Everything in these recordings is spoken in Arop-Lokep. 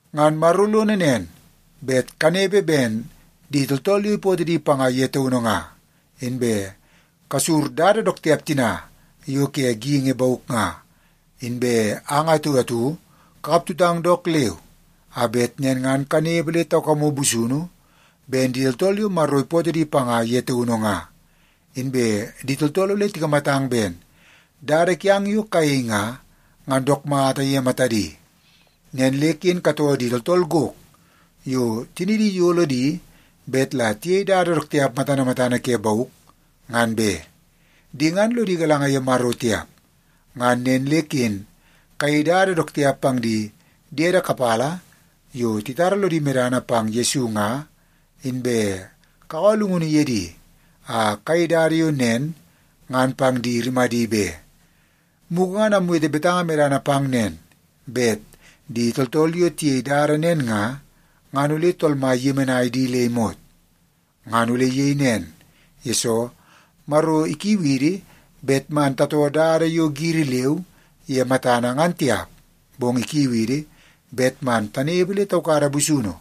Ngan Maro lono nen, bet kanepe ben di tooltool yo ipootoo di panga ye taunu nga, inbe kasur dada dook tiap tina yo ke geingi bauk nga. Inbe ang atu atu kakap tutang dook leu a bet nen ngan kanepe le taukamu busunu ben di tooltool yo Maro ipootoo di panga ye taunu nga, inbe di tooltool ole tikamatang ben dada kiang yo kayei nga, ngan dook mata ye matadi. Nen le ken katoo di tooltool gok yo tinidi iyolo di bet la tiyei dada dook tiap matana matana ke bauk, ngan be. Di ngan lodi galanga ye Maro tiap. Ngan nen le ken kayei dada dook tiap pang di diede kapala yo titara lodi medana pang Yesu nga, inbe kakaua llungunu ye di a kayei dada yo nen ngan pang di rimadi be. Mugu ngan amwete betanga medana pang nen, bet di tooltool yo tiyei dada nen nga, ngan ole Tool Mai iyemenai di le imot. Ngan ole iyei nen, yesoo Maro ikiu idi bet man tatoo dada yo giri leu ye matana ngan tiap, bong ikiu idi bet man tanepe le taukada busunu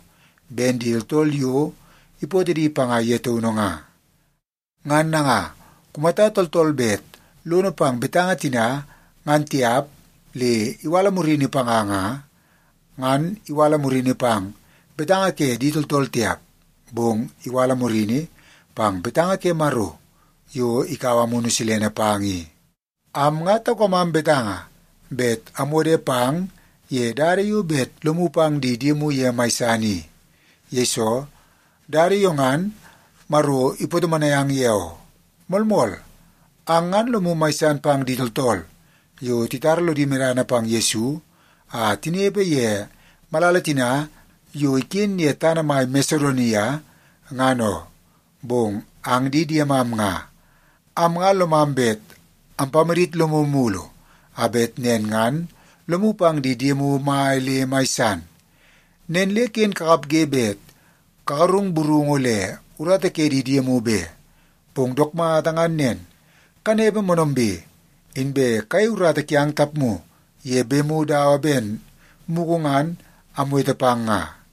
ben di tooltool yo ipootoo di panga ye taunu nga. Ngan nanga, kumata tooltool bet lono pang betanga tina ngan tiap le iwala murini panga nga, ngan iwala murini pang betanga ke di tooltool tiap, bong iwala murini pang betanga ke Maro yo ikaua Amunu Silene pang i. Am nga taukamam betanga bet amwode pang ye dada yo bet lomu pang di diemu ye mai san i. Yesoo, dada yo ngan Maro ipatomonai ang ye oo. Moolmool, ang ngan lomu mai san pang di tooltool yo titara lodi medana pang Yesu a tinepe ye malala tina yo iken ye tana mai Masedonia ngan oo. Bong ang di diemam nga, am nga lomam bet ampamadit lomu mulu a bet nen ngan lomu pang di diemu mai le mai san. Nen le ken kakapge bet kagarung burungu le urata ke di diemu be. Bong dook mata ngan nen, kanepe moonoombe, inbe kayei urata kiang tapmu ye bemu dawa ben mugu ngan amwete pang nga.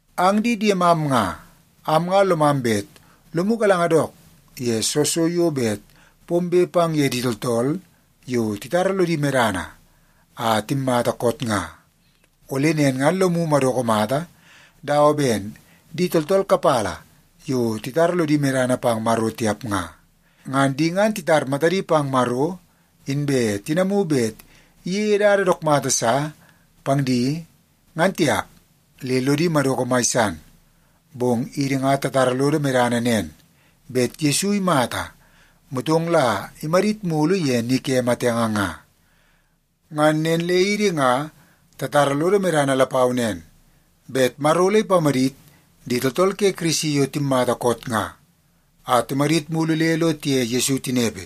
Ang di diemam nga, am nga lomam bet lomu galanga dook ye soo so yo bet pombe pang ye di tooltool yo titara lodi medana a timmata koot nga. Ole nen ngan lomu madoko mata dawa ben di tooltool kapala yo titara lodi medana pang Maro tiap nga. Ngan di ngan titar matadi pang Maro inbe tinamu bet iyeie dada dook mata sa pang di ngan tiap, le lodi madoko mai san. Bong idi nga tatara lodo medana nen, bet Yesu imata, motong la imadit mulu ye ni ke matenge nga. Ngan nen le idi nga tatara lodo medana lapau nen, bet Maro ole ipamadit di tooltool ke Kirisi yo timmata koot nga, a timadit mulu le lo tiye Yesu tinepe.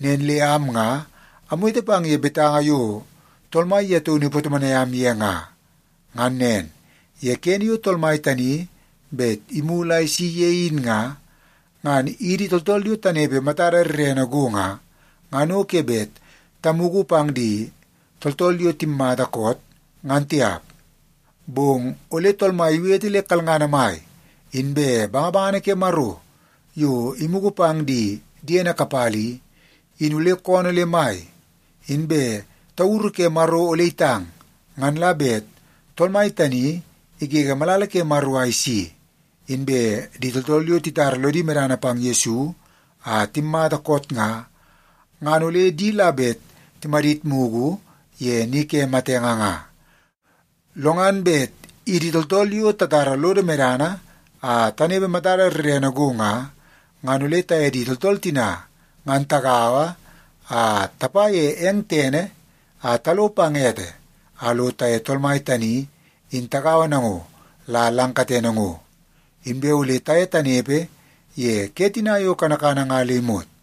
Nen le am nga amwete pang ye betanga yo Tool Mai ye taunu ipatomonai am ye nga. Ngan nen, ye kene yo Tool Mai tani bet imulu a isi ye in nga, ngan idi tooltool yo tanepe matada rrene go nga, ngan o ke bet tamugu pang di tooltool yo timatamata koot, ngan tiap. Bong ole Tool Mai iwete le kalngana mai, inbe bangabangana ke Maro yo imugu pang di diene kapala i, in ole koonoo le mai, inbe tauru ke Maro ole itang. Ngan la bet Tool Mai tani igege malala ke Maro a isi, inbe di tooltool yo titara lodi medana pang Yesu a timmata koot nga, ngan ole di la bet timadit mugu ye ni ke matenge nga. Lo ngan bet idi tooltool yo tatara lodo medana a tanepe matada rrene go nga, ngan ole taye di tooltool tina ngan tagaua a tapa ye eng tene a talo pang ete a lo taye Tool Mai tani in tagaua nango la lang katene ngo. Inbe ole taye tanepe ye ke tina yo kanakana nga le imot.